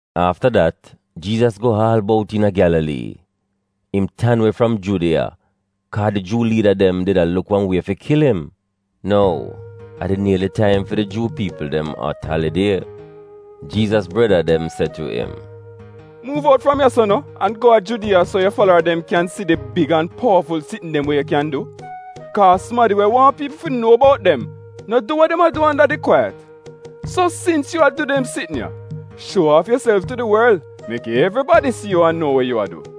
Afta dat, Jiizas go aal bout iina Gyalalii. Im tan we fram Judiya, kaa di Juu liida dem did a luk wan wie fi kil im. Nou, a did nieli taim fi di Juu piipl dem Ot Alidie. Jiizas breda dem se tu im, “Muuv out fram ya-so no, an go a Judiya so yu falara dem kyan si di big an powaful sitn dem we yu kyan du. Kaa, sumadi we waahn piipl fi nuo bout dem no du we dem a du anda di kwaiyat. So sins yu a du dem sitn ya, shuo aaf yuself tu di worl, mek evribadi si yu an nuo we yu a du.”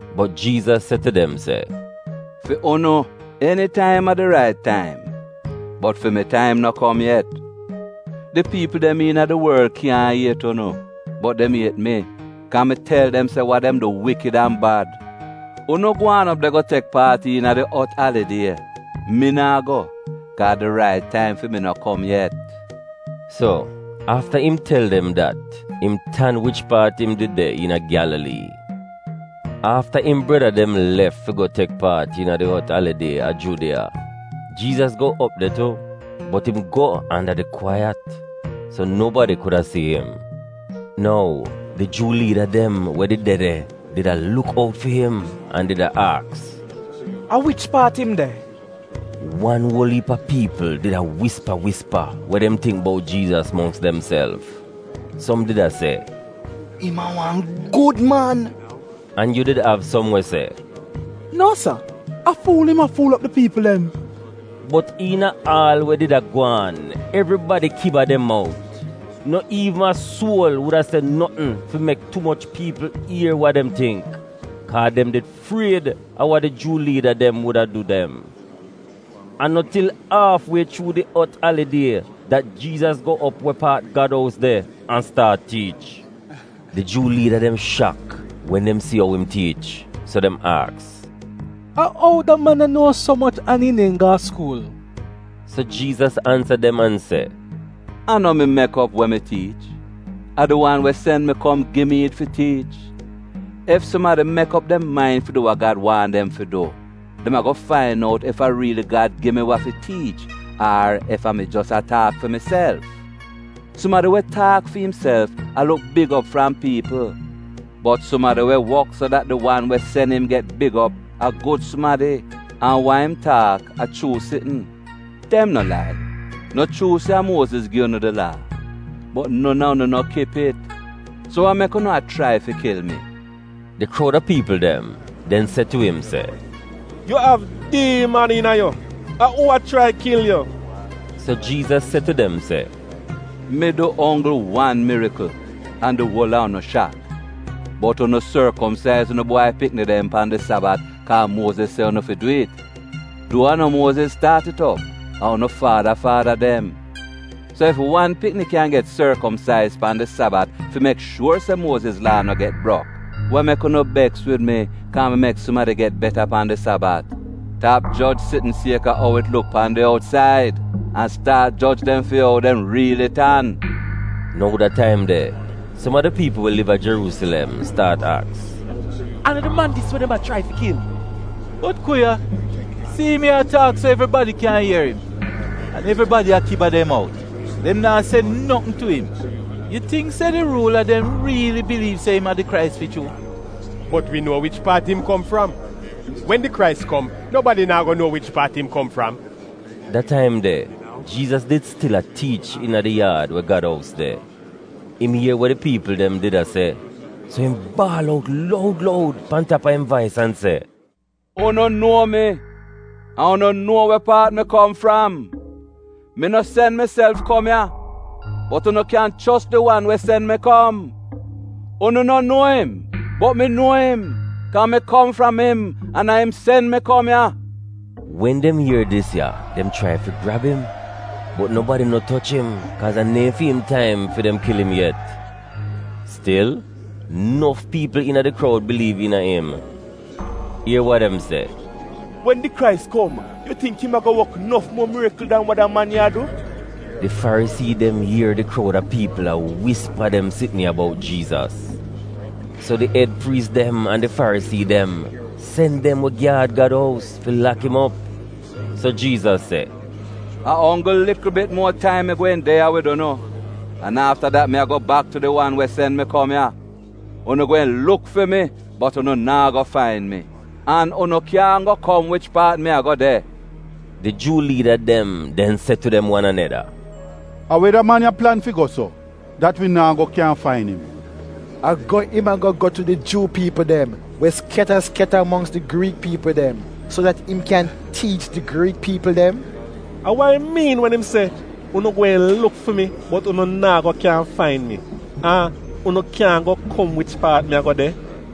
Bot Jiizas se tu dem se, “Fi unu, enitaim a di rait taim, bot fi mi taim no kom yet. Di piipl dem iina di worl kyaahn iet unu, bot dem iet mi kaa mi tel dem se wa dem du wikid an bad. Unu gwaan op de go tek paat iina di Ot Alidie. Mi naa go, kaa di rait taim fi mi go no kom yet.” So, afta im tel dem dat, im tan wich paat im did de iina Gyalalii. Afta im breda dem lef fi go tek paat iina di Ot Alidie a Judiya, Jiizas go op de tu, bot im go anda di kwaiyat, so nobadi kuda si im. Nou, di Juu liida dem we did de de did a luk out fi im an did a aks, “A wich paat im de?” Wan uol iip a piipl did a wispa wispa wa dem tingk bout Jiizas mongks demself. Som did a se, “Im a wan gud man.” An yu did av som we se, “Nuo, sa! A fuul im a fuul op di piipl dem.” Bot iina aal we did a gwaan evribadi kiba dem mout, no iivn a suol wuda se notn fi mek tu moch piipl ier wa dem tingk, kaa dem did fried a wa di Juu liida dem wuda du dem. A no til aaf wie chuu di Ot Alidie dat Jiizas go op we paat Gad ous de an staat tiich. Di Juu liida dem shak wen dem si ou im tiich, so dem aks, “A ou da man ya nuo so moch an im neehn go a skuul?” So Jiizas ansa dem an se, “A no mi mek op we mi tiich. A di wan we sen mi kom gi mi it fi tiich. Ef sumadi mek op dem main fi du wa Gad waahn dem fi du, dem ago fain out ef a riili Gad gi mi wa fi tiich ar ef a mi jos a taak fi miself. Sumadi we taak fi imself a luk big op fram piipl, bot sumadi we wok so dat di wan we sen im get big op, a gud sumadi an wa im taak a chuu sitn. Dem no lai. No chuu se a Muoziz gi unu di Laa? Bot non a unu no kip it. So wa mek unu a chrai fi kil mi?” Di kroud a piipl dem den se tu im se, “Yu av diiman iina yu! A uu a chrai kil yu?” So Jiizas se tu dem se, “Mi du onggl wan mirikl an di uol a unu shak. Bot, unu sorkomsaiz unu bwai pikni dem pan di Sabat kaa Muoziz se unu fi dwi'it — duo a no Muoziz staat it op, a unu faada faada dem. So ef wan pikni kyan get sorkomsaiz pan di Sabat fi mek shuor se Muoziz Laa no get brok, wa mek unu beks wid mi, kaa mi mek sumadi get beta pan di Sabat. Tap joj sitn sieka ou it luk pan di outsaid, an staat joj dem fi ou dem riili tan.” Nou da taim de som a di piipl we liv a Jeruusilem staat aks, “A no di man dis we dem a chrai fi kil? Bot ku ya! Si'im ya a taak so evribadi kyan ier im, an evribadi a kiba dem mout, dem naa se notn tu im. Yu tingk se di ruula dem riili biliiv se im a di Krais fi chuu? Bot wi nuo wich paat im kom fram. Wen di Krais kom, nobadi naa go nuo wich paat im kom fram.” Da taim de, Jiizas did stil a tiich iina di yaad we Gad ous de. Im ier we di piipl dem did a se, so im baal out loud loud pan tap a im vais an se, “Unu nuo mi an unu nuo we paat mi kom fram! Mi no sen miself kom ya, bot unu kyan chos di wan we sen mi kom. Unu no nuo im, bot mi nuo im, kaa mi kom fram im an a im sen mi kom ya.” Wen dem ier dis ya dem chrai fi grab im, bot nobadi no toch im, kaaz a neehn fi im taim fi dem kil im yet. Stil, nof piipl iina di kroud biliiv iina im. Ier wa dem se, “Wen di Krais kom, yu tingk im ago wok nof muo mirikl dan wa da man ya a du?” Di Farisii dem ier di kroud a piipl a wispa dem sitn ya bout Jiizas. So di ed priis dem an di Farisii dem sen dem we gyaad Gad ous fi lak im op. So Jiizas se, “A onggl likl bit muo taim mi gweehn de ya wid unu, an afta dat mi a go bak tu di wan we sen mi kom ya. Unu gweehn luk fi mi, bot unu naa go fain mi. An unu kyaahn go kom wich paat mi ago de.” Di Juu liida dem den se tu dem wan aneda se, “A we da man ya plan fi go so, dat wi naa go kyan fain im? A go im ago go tu di Juu piipl dem we skyata skyata mongks di Griik piipl dem, so dat im kyan tiich di Griik piipl dem? A wa im miin wen im se, ‘Unu gweehn luk fi mi, bot unu naa go kyan fain mi. An unu kyaahn go kom wich paat mi ago de’?”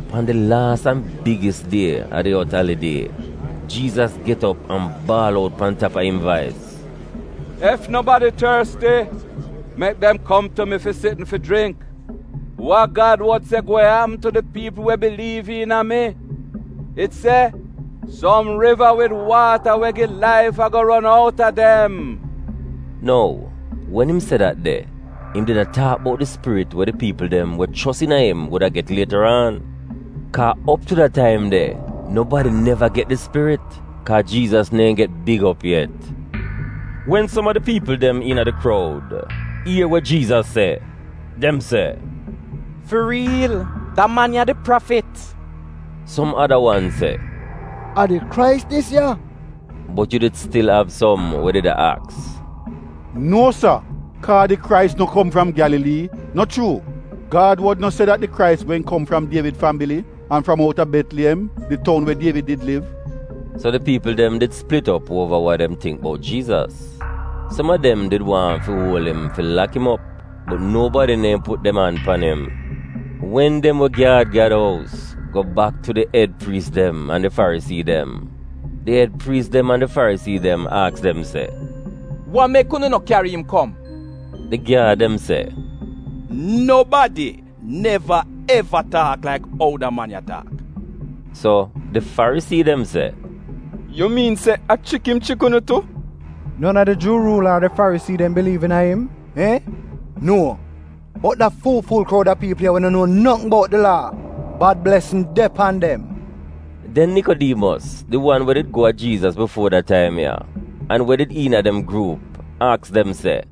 Pan di laas an bigis die a di Ot Alidie, Jiizas get op an baal out pan tap a im vais, “Ef nobadi torsti, mek dem kom tu mi fi sitn fi jringk. Wa Gad wod se gweehn apm tu di piipl we biliiv iina mi. It se, ‘Som riva wid waata we gi laif ago ron outa dem.’” (Nou, wen im se dat de, im did a taak bout di Spirit we di piipl dem we chos iina im wuda get lietaraan. Kaa op tu da taim de, nobadi neva get di Spirit, kaa Jiizas neehn get big op yet.) Wen som a di piipl dem iina di kroud ier we Jiizas se, dem se, “Fi riil, da man ya a di Prafit.” Som ada wan se, “A di Krais dis ya.” Bot yu did stil av som we did a aks, “Nuo sa, kaa di Krais no kom fram Gyalalii, no chuu? Gad wod no se dat di Krais gweehn kom fram Dievid fambili an fram outa Betliyem, di toun we Dievid did liv?” So di piipl dem did plit op uova wa dem tingk bout Jiizas. Som a dem did waahn fi uol im fi lak im op, bot nobadi neehn put dem an pan im. Wen dem we gyaad Gad ous go bak tu di ed priis dem an di Farisii dem, di ed priis dem an di Farisii dem aks dem se, “Wa mek unu no kyari im kom?” Di gyaad dem se, “Nobadi neva eva taak laik ou da man ya taak.” So, di Farisii dem se, “Yu miin se a chrik im chrik unu tu? Eni a di Juu ruula ar Farisii dem biliiv iina im, iihn? Nuo! Bot da fu-fuul kroud a piipl ya we no nuo notn bout di Laa — bad blesn de pan dem.” Den Nikodiimos, di wan we did go a Jiizas bifuo da taim ya an we did iina dem gruup aks dem se,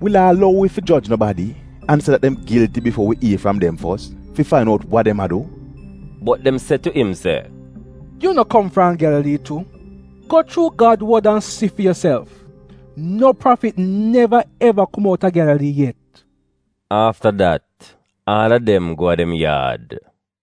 “Wi Laa lou wi fi joj nobadi an se dat dem gilti bifuo wi ier fram dem fos fi fain out wa dem a du?” Bot dem se tu im se, “Yu no kom fram Gyalalii tu? Go chuu Gad wod an si fi yuself — no prafit neva eva kom outa Gyalalii yet!” Afta dat, aal a dem go a dem yaad.